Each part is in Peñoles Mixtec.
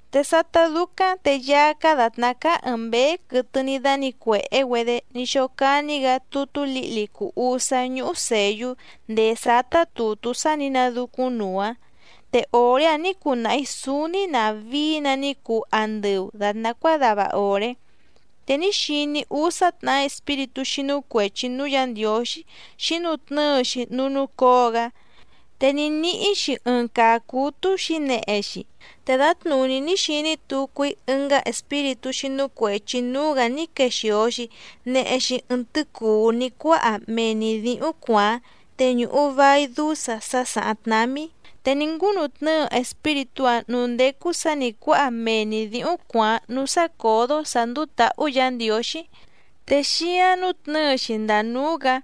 Te sátá dúcáⁿ te Yaá cáá dàtná cáá ɨ̀ɨⁿ mbéé quɨtɨ ní dánǐcuèhé‑güedé ní xócání‑gǎ tutú lǐhli cùu usá ñúhú sèyú ndèé sátá tùtú sá nǐ nadúcúⁿnuu‑áⁿ, te òré‑áⁿ nǐ cunahi sǔúní nàvií‑nǎ ní cuu andɨu dàtná cuádava òré. Te ní xiní‑í úsá tnàhá espíritú xínú cuèchi núú Yǎ Ndiǒxí xǐnutnɨ́ɨ‑xi núú núcǒo‑gá, te ní níhí‑xi ɨɨⁿ caa cǔtú xǐnehe‑xi. Te dǎtnùní ní xiní tucu‑í ɨngá espíritú xínú cuèchi núú‑gǎ ní quexìo‑xi nehe‑xi ɨɨⁿ tɨ́cùú ní cuáha mee‑ni dǐhúⁿ cuàáⁿ te ñùhu vai dúsa sá sàháⁿ tnámí, te ní ngúnutnɨ́ɨ espíritú‑áⁿ nǔú ndécú sǎ nǐ cuáha mee‑ni dǐhúⁿ cuàáⁿ núú sácǒdó sǎ ndúú tǎhú Yǎ Ndiǒxí, te xíǎⁿ nútnɨ̌ɨ‑xi ndàa núú‑gǎ,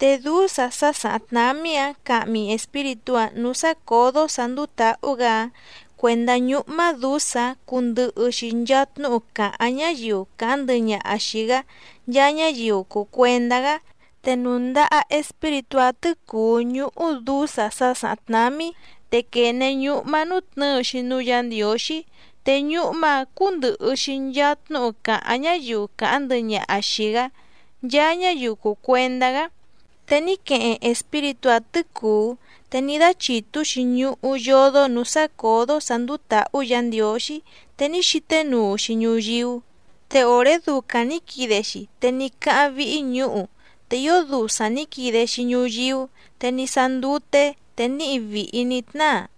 te dúsa sá sàháⁿ tnámí‑áⁿ cahmi espíritú‑áⁿ nǔú sácǒdó sǎ ndúú tǎhú‑gǎ‑áⁿ cuèndá ñúhmá dǔsa‑áⁿ cundɨhɨ‑xi nchaa tnúhu càháⁿ ñáyiu càháⁿ ndɨhɨ ñaha xìi‑gá, nchaa ñáyiu cùu cuendá‑gá. Te nùndaha espíritú‑áⁿ tɨ̌cùú ñúhú dǔsa sá sàháⁿ tnámí càyú, te quène ñúhmá nútnɨ̌ɨ‑xi núú Yǎ Ndiǒxí, te ñúhmá‑ǎⁿ cúndɨ̀hɨ‑xi nchaa tnúhu càháⁿ ñáyiu càháⁿ ndɨhɨ ñaha xìi‑gá, nchaa ñáyiu cùu cuendá‑gá. Te ní queheⁿ espíritú‑áⁿ tɨ̌cùú te ní dáchìtú‑xi ñuhú yódó nǔú sácǒdó sǎ ndúú tǎhú Yǎ Ndiǒxí, te ní xíténuu‑xi ñuyíú, te òré ducaⁿ nǐ quide‑xi te ní cáháⁿ víhí ñǔhu, te ío dusaⁿ nǐ quide‑xi ñuyíú, te ní sáá ndúté, te níhi vìhi ní tnáa.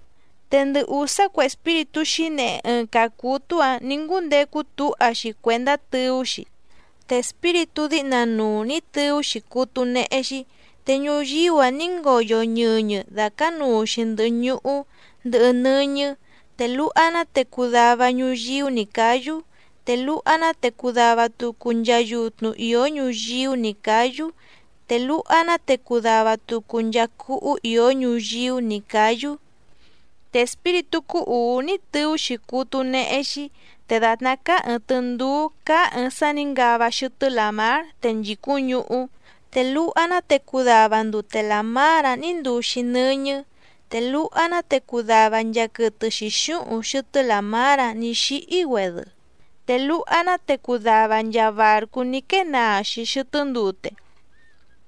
Te ndɨ ùsá cue espíritú xǐnehe ɨɨⁿ caa cǔtú‑ǎⁿ nǐ ngúndecu túha‑xi cuèndá tɨú‑xi. Te espíritú díhna nuu nǐ tɨú‑xi cútú néhé‑xí, te ñuyíú‑a ní ngoyo ñɨñɨ dàcánuu‑xi ndɨhɨ ñuhú ndɨhɨ nɨ́ñɨ́, te luha‑ná te cuu dava ñuyíú nǐ cáyú, te luha‑ná te cuu dava tucu nchaa yutnu ìó ñuyíú nǐ cáyú, te luha‑ná te cuu dava tucu nchaa cúhú ìó ñuyíú nǐ cáyú. Te espíritú cúú ùú ní tɨú‑xi cútú néhé‑xí, te dàtná cáá ɨ̀ɨⁿ tɨndúú cáá ɨ̀ɨⁿ sá nǐ ngava xɨtɨ́ làmár te nchìcúⁿ ñuhú, te luha‑ná te cuu dava ndute làmár‑áⁿ nǐ nduu‑xi nɨ́ñɨ́. Te luha‑ná te cuu dava nchaa quɨtɨ xǐxúhuⁿ xɨtɨ́ làmár‑áⁿ nǐ xíhí‑güedɨ, te luha‑ná te cuu dava nchaa bàrcú ní quée naa‑xi xɨtɨ́ ndute.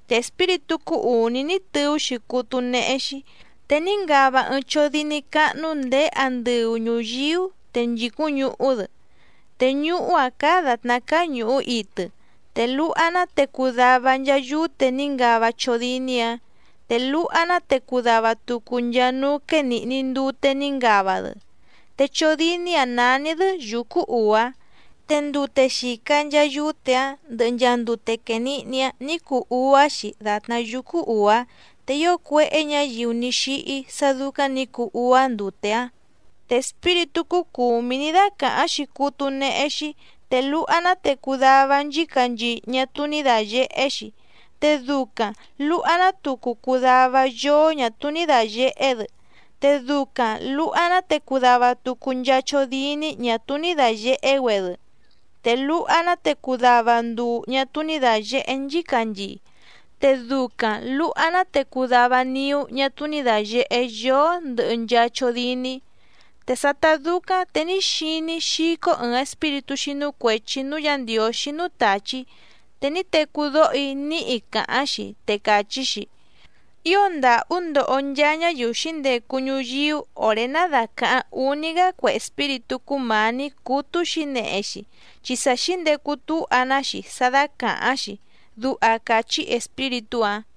Te espíritú cúú ùní ní tɨú‑xi cútú néhé‑xí, te ní ngava ɨɨⁿ chódíní cáhnú ndèé andɨu ñuyíú te nchìcúⁿ ñuhú‑dɨ, te ñuhú‑áⁿ cáá dàtná cáá ñùhú itɨ. Te luha‑ná te cuu dava nchaa yúte ní ngava chódíní‑ǎⁿ, te luha‑ná te cuu dava tucu nchaa núú quénìhni ndute ní ngava‑dɨ. Te chódíní‑ǎⁿ nání‑dɨ́: Yǔcú Ùá. Te ndute xìca nchaa yúte‑áⁿ ndɨhɨ nchaa ndute quènihni‑áⁿ nǐ cuu úá‑xi dàtná yúcú ùá, te ío cuéhé ñǎyiu ní xíhí sá dúcáⁿ nǐ cuu úá ndute‑áⁿ. Te espíritú cúú cùmí ní dácàháⁿ‑xi cútú néhé‑xí, te luha‑ná te cuu dava nchícanchii ñá túú ní dàyehé‑xi, te ducaⁿ lùha‑ná tucu cuu dava yóó ñà túú ní dàyehé‑dɨ, te ducaⁿ lùha‑ná te cuu dava tucu nchaa chódíní ñà túú ní dàyehé‑güedɨ, te luha‑ná te cuu dava nduu ñà túú ní dàyehé nchícanchii, te ducaⁿ lùha‑ná te cuu dava niú ñá túú ní dàyehé yóó ndɨhɨ nchaa chódíní. Te sátá dúcáⁿ te ní xiní‑í xícó ɨ̀ɨⁿ espíritú xínú cuèchi núú Yǎ Ndiǒxí núú tàchí, te ní tecú dóho‑í níhi càháⁿ‑xi, te càchí‑xi: —¡Ío ndàhú ndoho nchaa ñáyiu xǐndecu ñuyíú òré ná dàcaháⁿ úní‑gá cue espíritú cúmǎní cútú xǐnehe‑xi, chi sa xǐndecu túha‑ná‑xi sá dácàháⁿ‑xi!— duha càchí espíritú‑áⁿ.